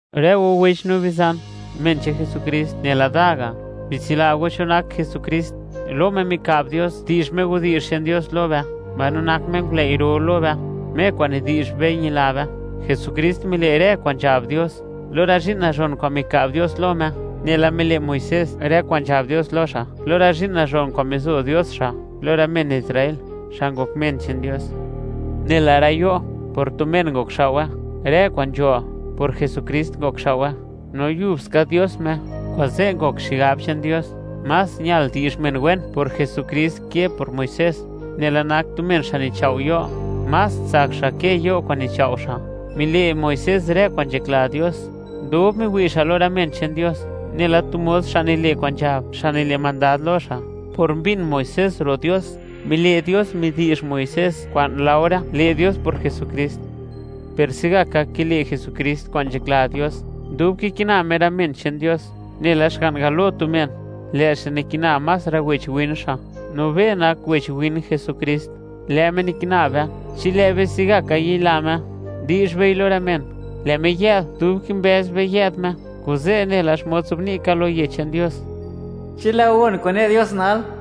Rë go wech no bizan, men che'n Jesukrist nela da ga', bitsila go cho nak Jesukrist: lo Me mika'b Dios di'zh Me widi'zh che'n Dios lo be, mbaino nak Me ngulëi' ro lo be, Me kwa'n nidi'zh be ñila be. Jesukrist mile' rë kwa'n nzhab Dios lo rë zhi'n nazhon kwa'n mika'b Dios lo Me, nela mile' Muisés rë kwa'n nzhab Dios lo xa' lo rë zhi'n nazhon kwa'n mizo Dios xa' lo rë men Israel, xa' ngok men che'n Dios. Nela rë yo', por tu men ngokxao'we; rë kwa'n nzho, por Jesukrist ngokxao'we, no yub ska Dios Me. Kuze', ngok xigab che'n Dios, más ñal di'zh men wen por Jesukrist ke por Muisés, nela nak tu men xa' nichao' yo'; más tsak xa' ke yo' kwa'n nichao' xa'. Mile' Muisés rë kwa'n nzhakla Dios, dub miwi' xa' lo rë men che'n Dios, nela tu mos xa' nile' kwa'n nzhab xa' nile' mandad lo xa'. Por mbin Muisés ro' Dios, mile' Dios midi'zh Muisés kwa'n laore le' Dios por Jesukrist. Per se'gaka kile' Jesukrist kwa'n nzhakla Dios, dub kikina Me rë men che'n Dios, nela xga'n galo tu men, lë' xa' nikina más rë wech win xa'. No be nak wech win Jesukrist, lë' Me nikina be, chi lë' be se'gaka yila Me, di'zh bei lo rë men, lë' Me yë'd dub kimbëz be yë'd Me. Kuze', nela xmod nzobni' ka lo Yech che'n Dios: Chi lë' go gon kwa'n ne Dios nal,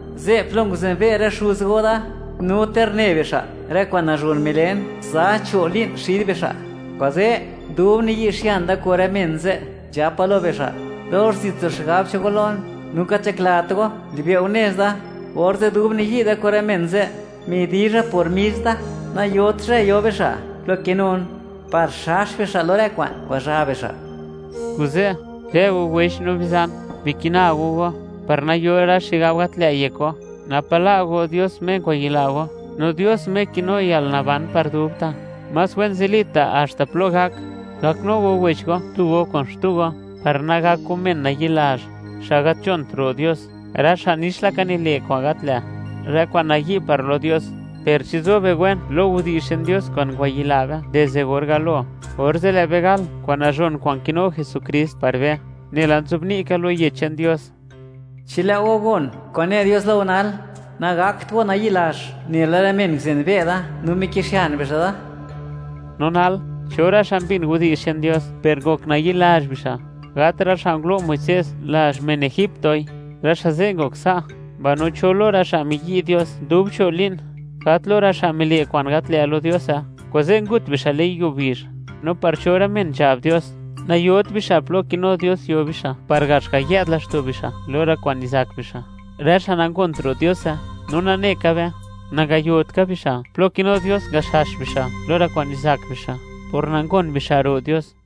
ze' plo nguzenbe' rë xuz go Da. No ter une bixa' rë kwa'n nazhon milen za cho' li'n xid bixa'. Kuze', dub niyi'xian Da kun rë men ze', nzhapa lo bixa': “Dox zit nzo xigab che'n go lon, no gat nzhaklat go, li'be' go nez Da.” Orze' dub niyi' Da lo rë men ze', midizha por mis Da: “Nayot zhë yo bixa' plo kinun, par xax bixa' lo rë kwa'n ngwazha bixa'.” Kuze', rë go wech no bizan, bikina go go, par nayo rë xigab gat lë' yek go, napa' la' go Dios Me ngwayila go, no Dios Me kinu yalnaban par dubta'. Más wen zilita' haxta plo gak, gaknu go wech tu go kun xtu go, par nagak go men nayi'lazh, xa' gat nzhont ro' Dios, rë xa' nix laka nile' rë kwa'n gat lë', rë kwa'n nayi' par lo Dios. Per chi zo be wen lo widi'zh che'n Dios kwa'n ngwayila be dizde or galo, orze' lë' be gal kwa'n nazhon kwa'n kinu Jesukrist par be. Nela nzobni' ka lo Yech che'n Dios: Chi lë' go gon kwa'n ne Dios lo go nal, nagakt go nayi'lazh nela rë men nguzenbe' Da, no miki'xian bixa' Da. No nal, ¿cho rë xa' mbin widi'zh che'n Dios per ngok nayi'lazh bixa'? Gat rë xa' ngulo' Muisés lazh men egiptoi, rë xa' ze' ngok sa'. Mbaino, ¿cho lo rë xa' miyi' Dios dub cho' li'n? Gat lo rë xa' mile' kwa'n gat lë' lo Diose, kuze' ngut bixa' le'n yuo bizh. No, ¿par cho rë men nzhab Dios: Nayot bixa' plo kinu Dios yo bixa' par gax ga' yë'd laxto' bixa' lo rë kwa'n nizak bixa'? Rë xa' nangont ro' Diose. No nane ka be, nangayot ka bixa' plo kinu Dios ngaxax bixa' lo rë kwa'n nizak bixa', por nangon bixa' ro' Dios.